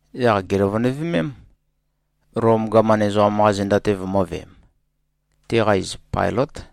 Yaq gèløvønøvemém, Lom gaman ezoqam-qa zenda-te vømø̄veem. Teqa iz Pailǿt.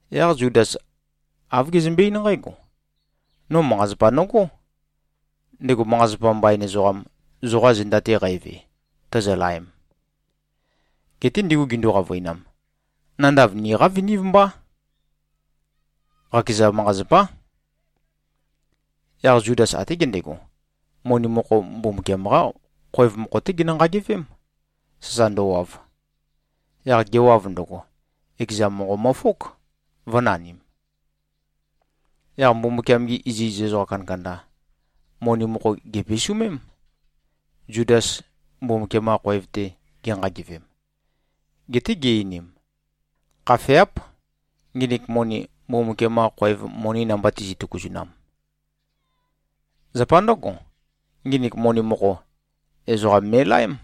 Yaq Zudas āv gezømbe-eín nqǽgo, “No manqa-zapa nøgó, ndego manqa-zapa mbain ezoqam, zoqa zenda-te qæve, tozolaem.” Geté ndigu gindu-qavøinam, “Nandav niqá vinív mbá. Qakeza manqa-zapá.” Yaq Zudas até gendego, moni mokho Mbumbukiam-qá khoev mokho-té genø-nqagevém, sasa ndøwav. Yaq gewav ndøgo, ekeza monqo møfók, vø̄nanim. Yaq Mbumbukiam-gi iziz ezoqa kandakanda, moni mokho gèpisumém, Zudas Mbumbukiam-qa khoev-te genqagevem. Geté gi-einim, “Khafeáp, nginik moni, Mbumbukiam-qa khoev moni namba tizi꞉-tøkuzunam. Zapa ndǿgo, nginik moni mokho, ezoqam me꞉laém.”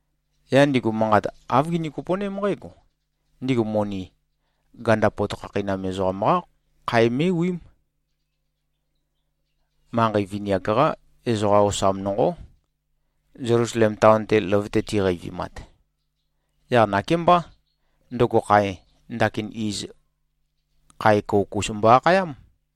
Yaq ndigu manqat āv gini-kopo꞉ném nqǽgo: Ndigu moni, ganda pot khakheinam ezoqam-qá khae mé꞉wiím. Manqei vini-ak-qá ezoqa osam nonqó, Zelusalem taon-te løvøte tiqeivimat. Yaq nakémbá, ndøgo khae, ndakin iz “khae kouk-us” mbo-akhayám.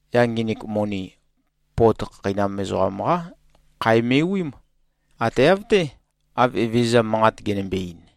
yaq nginik moni, pot khakheinam ezoqam-qá khae me꞉wiím. Ate av-té, av Evezøza manqat genømbe-ein.”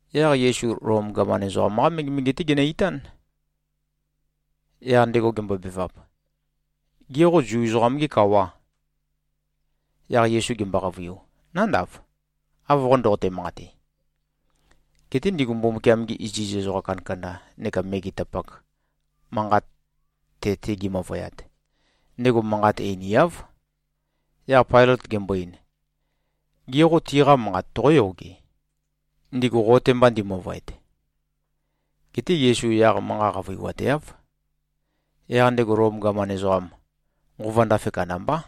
Yaq Yesu Lom gaman ezoqam-qá megemege-té genø-itán. Yaq ndego gembobevap, “Gê, qo Zu ezoqam-gê kawà?” Yaq Yesu gembo-qavøiu, “Nándav, av qo ndoqote-manqate.” Geté ndigu Mbumbukiam-gi iziz ezoqa kandakanda neka megetapak manqat te-te gimøvøyat, ndego manqat einiáv. Yaq Pailøt gembo-ein, “Gê, qo tiqa manqat toqóyoge, ndigu qo-te mba ndimøvøet?” Geté Yesu yaq manqa qavøiwateáv. Yaq ndego Lom gaman ezoqam, nqova ndafe kandambá.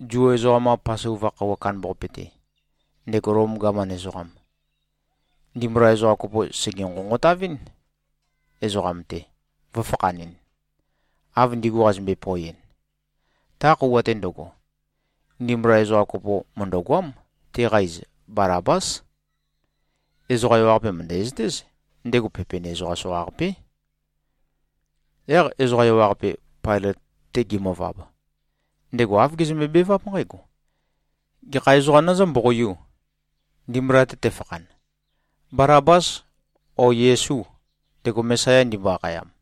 Zu ezoqam-qa Pasova khøuwa kandambaqape-te, ndego Lom gaman ezoqam, ndimbula ezoqa kopo sège-nqonqotavɨ́n, ezoqam-te, vø̄fakhanɨn, av ndigu qazømbe-poeɨn. Ta khøuwa-te ndøgo, ndimbula ezoqa kopo mø̀ndøgoám. Teqa iz Balabás. Ezoqa ewaqape mø̀ndæzøtéz, ndego pepen ezoqam soqaqapé. Yaq ezoqa ewaqape, Pailøt-te gimøvab, ndego āv gezømbe-beváp nqǽgo, “Gekha ezoqā nøzǿ-mboqoiū, ndimbula-te tefakhan? Balabâs, ó, Yesû, ndego Mesaya ndimbo-akhayam?”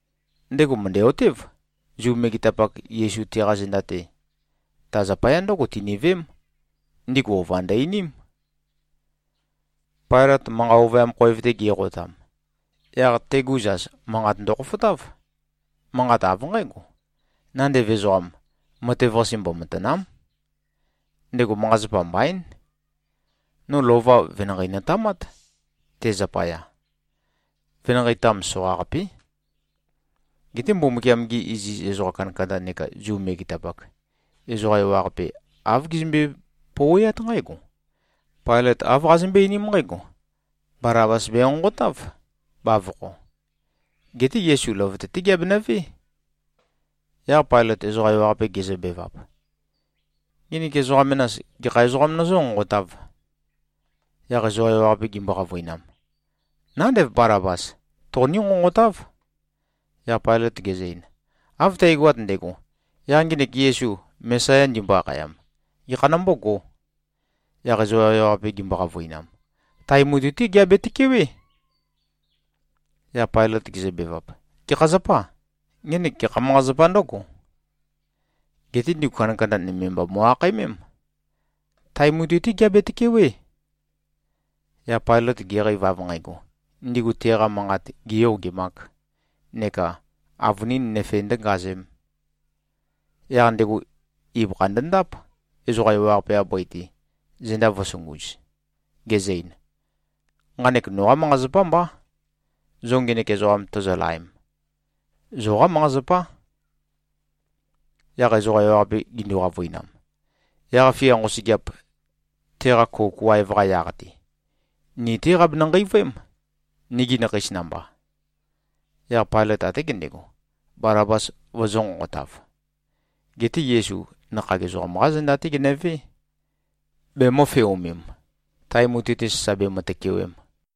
Ndego mø̀ndæ-otév, Zu megetapak, Yesu teqa zenda-te, ta zapaya ndǿgo tiniveém. Ndigu ova ndø-einím. Pailøt manqa ovøyam khoev-te ge꞉qotam, yaq tegu zas manqat ndokhofotáv. Manqat av nqǽgo, “Nandev ezoqam, matev-qase mbomatàna᷄m. Ndego manqa-zapa mbaín. No lova venanqei notamát, te zapaya. Venanqei-tam soqaqapé.” Geté Mbumbukiam-gi iziz ezoqa kandakanda neka Zu megetapak, ezoqa ewaqape āv gizømbe-pouweát nqǽgo, “Pailot āv qazømbøé-einím nqǽgo: Balabas benqonqotáv, bavokho. Geté Yesu løvøte-té geabenøvé.” Yaq Pailøt ezoqa ewaqape gezøbevap, “Nginik ezoqa menas, gekha ezoqām nøzǿ-nqonqotāv?” Yaq ezoqa ewaqape gimbo-qavøinam, “Nándev, Balabas, toqoní-nqonqotáv!” Yaq Pailøt gezø-ein, “Av tægoat ndægo, yaq ngenek Yesu, Mesaya ndimbo-akhayam, gekha nombógō?” Yaq ezoqa ewaqape gimbo-qavøinam, “Tae mutui-té geabe-tøkewé.” Yaq Pailøt gezøbevap, “Gekha zapâ? Ngenek gekha manqa-zapā ndǿgo?” Geté ndigu kandakanda nøme mba mo꞉-akhaemém, “Tae mutui-té geabe-tøkewé.” Yaq Pailøt geqeiv, av nqægo, ndigu teqa manqat gēyogemāk neka avønīn nøfe ndø̄ngazēm, yaq ndego ibøkha ndøndáp, ezoqa ewaqape-qa bøi-te, zenda vø̄sunguz, gezø-ein, “Nqanek noqá manqa-zapá mbá, zo ngenek ezoqam tozolaem. Zoqá manqa-zapá.” Yaq ezoqa ewaqape gindu-qavøinam, “Yaq-fia nqosøgeap, teqa kouk waev-qa yaq-te, ni-té qabenø-nqeivøém, nigi nakheis namba.” Yaq Pailøt até gendego, Balabas vøzø̄-nqonqotav. Geté Yesu nakhag ezoqam-qá zenda-té genøvé, bemø̄feomem, tae mutui-te sasa bemø-tøkewem.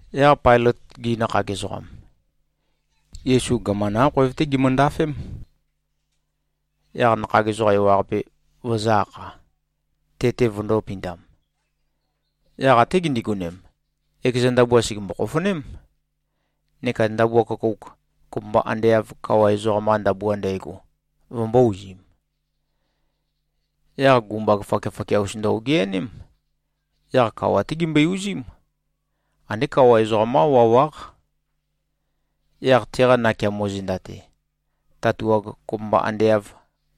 Yaq Pailøt-gi nakhag ezoqam, Yesu gaman-qá khoev-té gimøndafém, yaq nakhag ezoqa ewaqape vøzø̄-akha, te-te vøndō-pindam. Yaq até gindigonem, ekeza ndabua sègembo-khofoném, neka ndabua køkouk, kopømba ande av kawa ezoqam-qa ndabua ndægo, vømbō-uzim. Yaq gumbag fakiafakia-us ndø-ogeaném. Yaq kawa-té gimbøe-uzím. Andé kawa ezoqam-qá wawáq. Yaq teqa nakeamo zenda-te, tatuag, kopømba ande av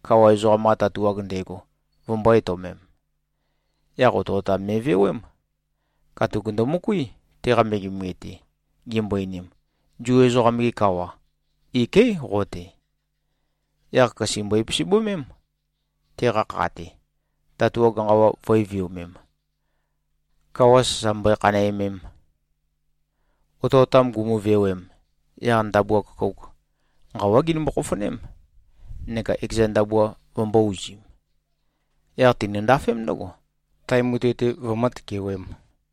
kawa ezoqam-qa tatuag ndægo, vømbō-etøomem. Yaq otøotam me꞉vewém. Katuk ndømøkuí, teqa megemege-te, gimbo-einim, “Zu ezoqam-ge kawa. Iké꞉ qo-te.” Yaq køse mbøe-pisibømém, teqa kha-te, tatuag nqawa vø̄e-viomem, kawa sasa mbøe-khanæmem. Otøotam gumuvewem, yaq ndabua køkouk, nqawá ginømbo-khofoném, neka ekeza ndabua vømbō-uzim. Yaq tinøndafém ndǿgo, tae mutui-te vømǿ-tøkewēm.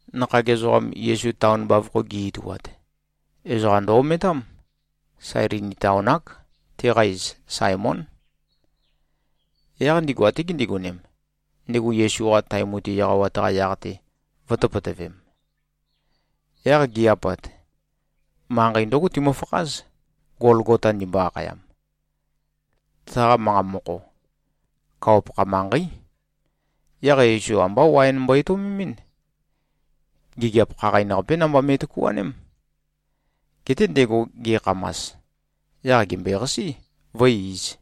Nakhag ezoqam, Yesu taon bavokho gi꞉-ituat, ezoqa ndø-ometám. Sailini taon-ák. Teqa iz Saemón. Yaq ndigu até gindigonem, ndego Yesu-qa tae mutui eqawat-qa yaq-te vø̄tøpøtøvem. Yaq gi꞉-apat, manqei ndǿgo timøfakház, Golgota ndimbo-akhayam. Taqa manqa mokho, “Kawa-pakha manqeí.” Yaq Yesu ambá waen mbo-etøomemɨ́n. Gigiap khaqain-qapé namba me꞉tøkuaném. Geté ndego ge꞉khamas, yaq gèmbøeqasí, vǿe-īz.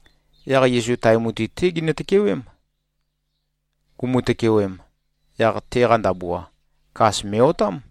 Yaq Yesu tae mutui-té ginø-tøkewém. Gumu-tøkewem, yaq teqa ndabua, kas me꞉-otám.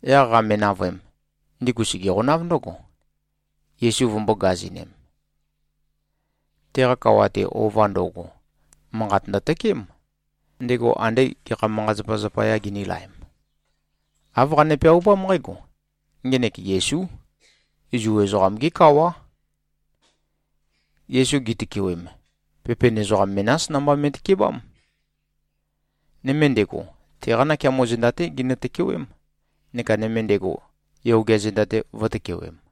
Yaq qame-navøem, ndigu sègeqonáv ndøgo, Yesu vømbō-gazinem. Teqa kawa-te, ova ndo꞉go, manqat ndøtøkeém, ndego andé gekha manqa-zapa zapayā ginīlaem. Āv qane-peaupám nqǽgo, “Ngenek Yesú. Zu ezoqam-gé kawá.” Yesu gitøkewem, pepen ezoqam menás namba me꞉tøkebám. Nøme ndego, teqa nakeamo zenda-té ginø-tøkewém, neka nøme ndego, yogea zenda-te vø̄tøkewem.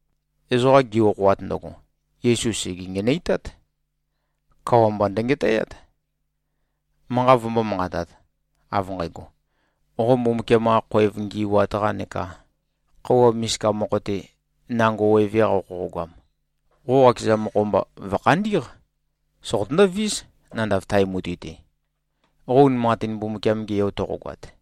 Ezoqa gi-okhoat ndøgo, Yesu sège-ngenøitát. Kawa mba ndøngetæát, manqat vombō-manqatat, av nqægo, “Qo Mbumbukiam-qa khoev ngi꞉wat-qa neka khøuwa misika mokho-te nango weve-qa qoqogoam, qo qakeza mokho-mba vø̀khandí꞉q. Soqotøndó-vís, nandav tae mutui-te, qo unimanqatin Mbumbukiam-ge Yo toqogoat.”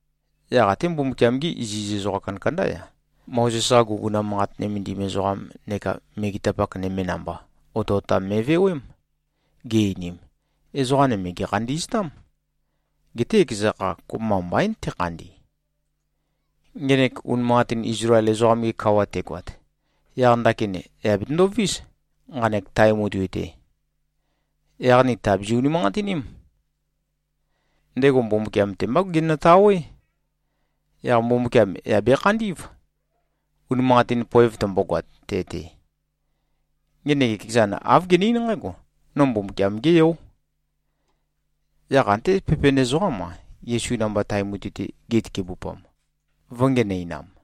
Yaq até Mbumbukiam-gí iziz ezoqa kandakandá-ya, Mozes-qa guguna manqat nømendim ezoqam neka megetapak nøme namba, otøotam me꞉vewém. Gi-einim, “Ezoqa nøme gèkhandi꞉ztám. Geté ekeza kha, kopømba mbaín tekhandi. Ngenek unimanqatin Izlael ezoqam-ge kawa tegoat, yaq ndakin yà betøndovís, nqanek tae mutui-te. Yaq ni tàbizi-unimanqatiním. Ndego Mbumbukiam-te mbá genøtawé. Yaq Mbumbukiam yà bekhandí꞉v, unimanqatin poev tømbogoat te-te. Ngenek ekezan āv gene-eín nqǽgo, ‘No Mbumbukiam-gé Yó.’” Yaq até pepen ezoqám-a, Yesu namba tae mutui-te gitøkebupam, vø̄ngenøinam.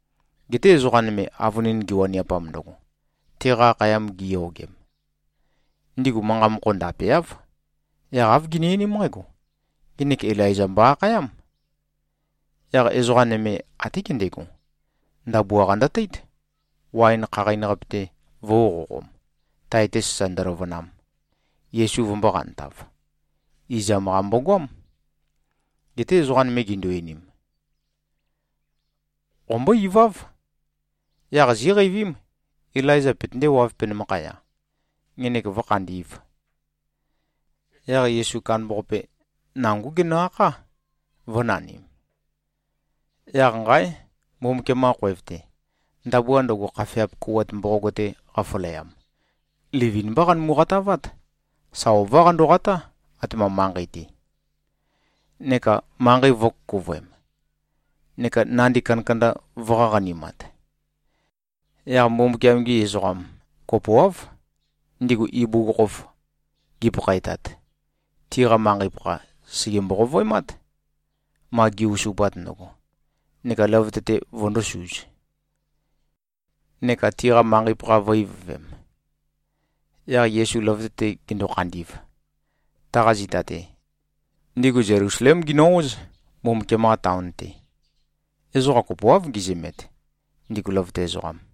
Geté ezoqa nøme, avønin giwaniapam ndøgo, teqa akhayam giyogem, ndigu manqa mokho ndapeáv. Yaq āv gini-einím nqǽgo, “Ngenek Ilaiza mbo-akhayám.” Yaq ezoqa nøme até gendego, ndabua-qa ndøteít, waen khaqain-qape-te vø̄uqoqom, tae-te sasa ndøløvønam, Yesu vømbō-qantav. Izam-qa mbogoám. Geté ezoqa nøme gindu-einim, “Qombó-iváv. Yaq zíqeivím, Ilaiza petøndéwāv, penømakhaya, ngenek vǿkhandī꞉v.” Yaq Yesu kandambaqape, nangó genø-akhá, vø̄nanim. Yaq nqáe! Mbumbukiam-qa khoev-te, ndabua ndøgo, khafeap kouwat mboqog-te qafaleam, livin-mbá qanømu-qatavát. Sa ová qandoqatá, atema manqei-te. Neka manqei vø̄kukuvøem, neka nandi kandakanda vø̄-qaqanimat. Yaq Mbumbukiam-gi ezoqa kopoáv, ndigu ibugukhokhof gipakhaetat, tiqa manqei-pakha sège-mboqovøemát, ma gi-osupat ndøgo, neka løvøte-te vøndōsuz, neka tiqa manqei-pakha vø̄-ivøvem. Yaq Yesu løvøte-te gendo-khandi꞉v, taqa zita-te, ndigu Zelusalém ginø-óz, Mbumbukiam-qa taon-te. Ezoqa kopoáv gizømet, ndigu løvøte ezoqam.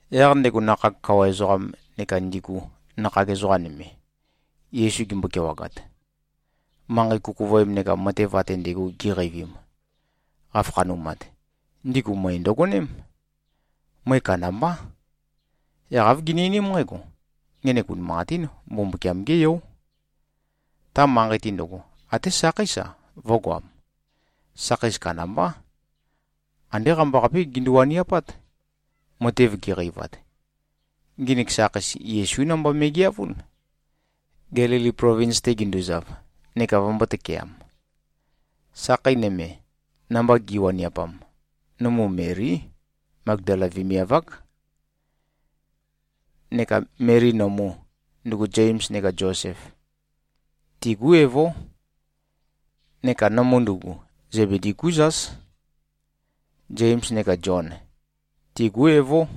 Yaq ndego nakhag kawa ezoqam neka ndigu nakhag ezoqa nøme, Yesu gimbo-kewagat, manqei kukuvøem neka matev ate ndægo giqeivim, qafakhanumat, ndigu møe ndøgoném. Møe kandambá. Yaq āv gini-einím nqǽgo, “Ngenek unimanqatín Mbumbukiam-gé Yó.” Ta manqei-te ndøgo, até sakheís-a, vø̄goam. Sakheis kandambá. Andé qambaqapé gindu-waniapát, matev giqeivat. Nginik sakheis Yesú namba me꞉geavún, Gelili plovins-te ginduzav, neka vømbō-tøkeam. Sakhei nøme, namba gi꞉waniapam, nømu Melí. Magdala vemiav-ák. Neka Meli nømu, ndugu Zems neka Zosef, tigú evó. Neka nømu ndugu, Zebedi-gú zás. Zems neka Zion, tigú evó.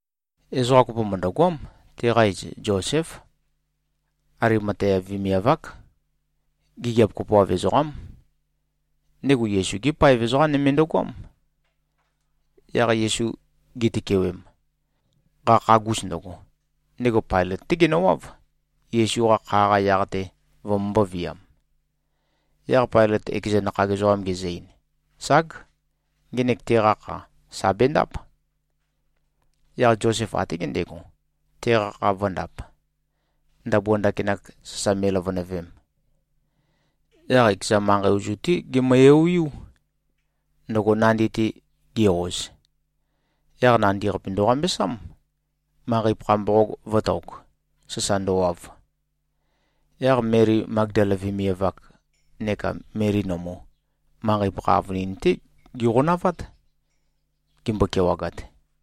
Ezoqa kopo mø̀ndøgoám. Teqa iz Zoséf. Alimatea vemiav-ák. Gigiap kopoav ezoqám. Ndego Yesu-gé paev ezoqam nøme ndøgoám. Yaq Yesu gitøkewem, qakhagus ndøgo, ndego Pailøt-té genøwáv, Yesu-qa kha-qa yaq-te vømømbō-viam. Yaq Pailøt ekeza nakhag ezoqam gezø-ein, “Ság. Ngenek teqa kha, sà bendáp.” Yaq Zosef até gendego, teqa kha vø̄ndap, ndabua ndakinak sasa me꞉løvønøvem. Yaq ekeza manqei ozu-té gemø-eoeiú, ndøgo nandi-te ge-oz. Yaq nandi-qape ndøqambesám, manqei-pakha mboqog vø̄tok, sasa ndøwav. Yaq Meli Magdala vemiav-ak neka Meli nømu, manqei-pakha avønin-té giqonavát, gimbo-kewagat.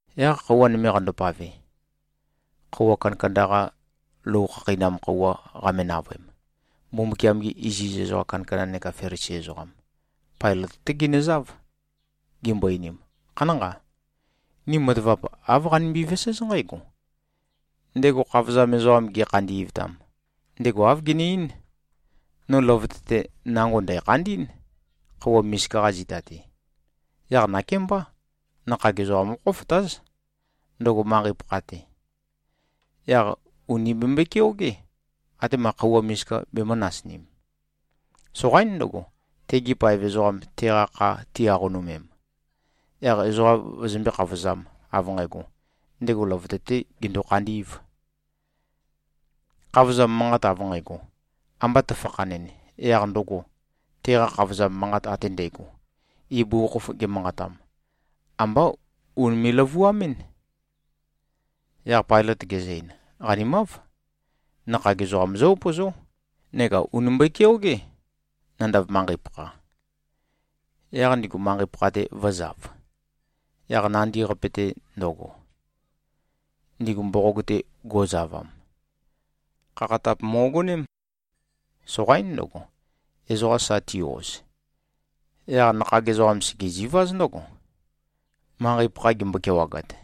Yaq khøuwa nøme qandopave, khøuwa kandakanda-qa lou khakheinam khøuwa qame-navøem, Mbumbukiam-gi iziz ezoqa kandakanda neka Felisi ezoqam, Pailøt-té ginøzáv. Gimbo-einim, “Khanánqa. Ni matavap āv qanimbi-veséz nqǽgo: Ndego khavozam ezoqam gekhandi꞉vtam, ndego āv gene-eín, ‘No løvøte-te nango ndæ̀khandí꞉n, khøuwa misika-qa zita-te.’ Yaq nakémbá. Nakhag ezoqam qókhofotáz, ndøgo manqei-pakha-te. Yaq ùni bembøe-keogé, atema khøuwa misika bemø̄-nasinim. Soqaín ndøgo, tegi paev ezoqam teqa kha ti-aqonømem, yaq ezoqa vøzømbé-khavozām, av nqægo, ‘Ndego løvøte-tē gendo-khandī꞉v.’ Khavozam manqat av nqægo, amba tøfakhanɨn, yaq ndøgo, teqa khavozam manqat ate ndægo, ibugukhokhof gemanqatam, ambá unime꞉-løvuamɨ́n.” Yaq Pailøt gezø-ein, “Qanimáv. Nakhag ezoqam zó-upøzó. Neka ùni mbøe-keogé, nandav manqei-pakha.” Yaq ndigu manqei-pakha-te vø̄zav. Yaq nandi-qape-te ndøgo, ndigu mboqog-te go꞉zavam, khakhatap mo꞉goném. Soqaín ndøgo, ezoqa sa ti-oz. Yaq nakhag ezoqam, sègeziváz ndøgo, manqei-pakha gimbo-kewagat.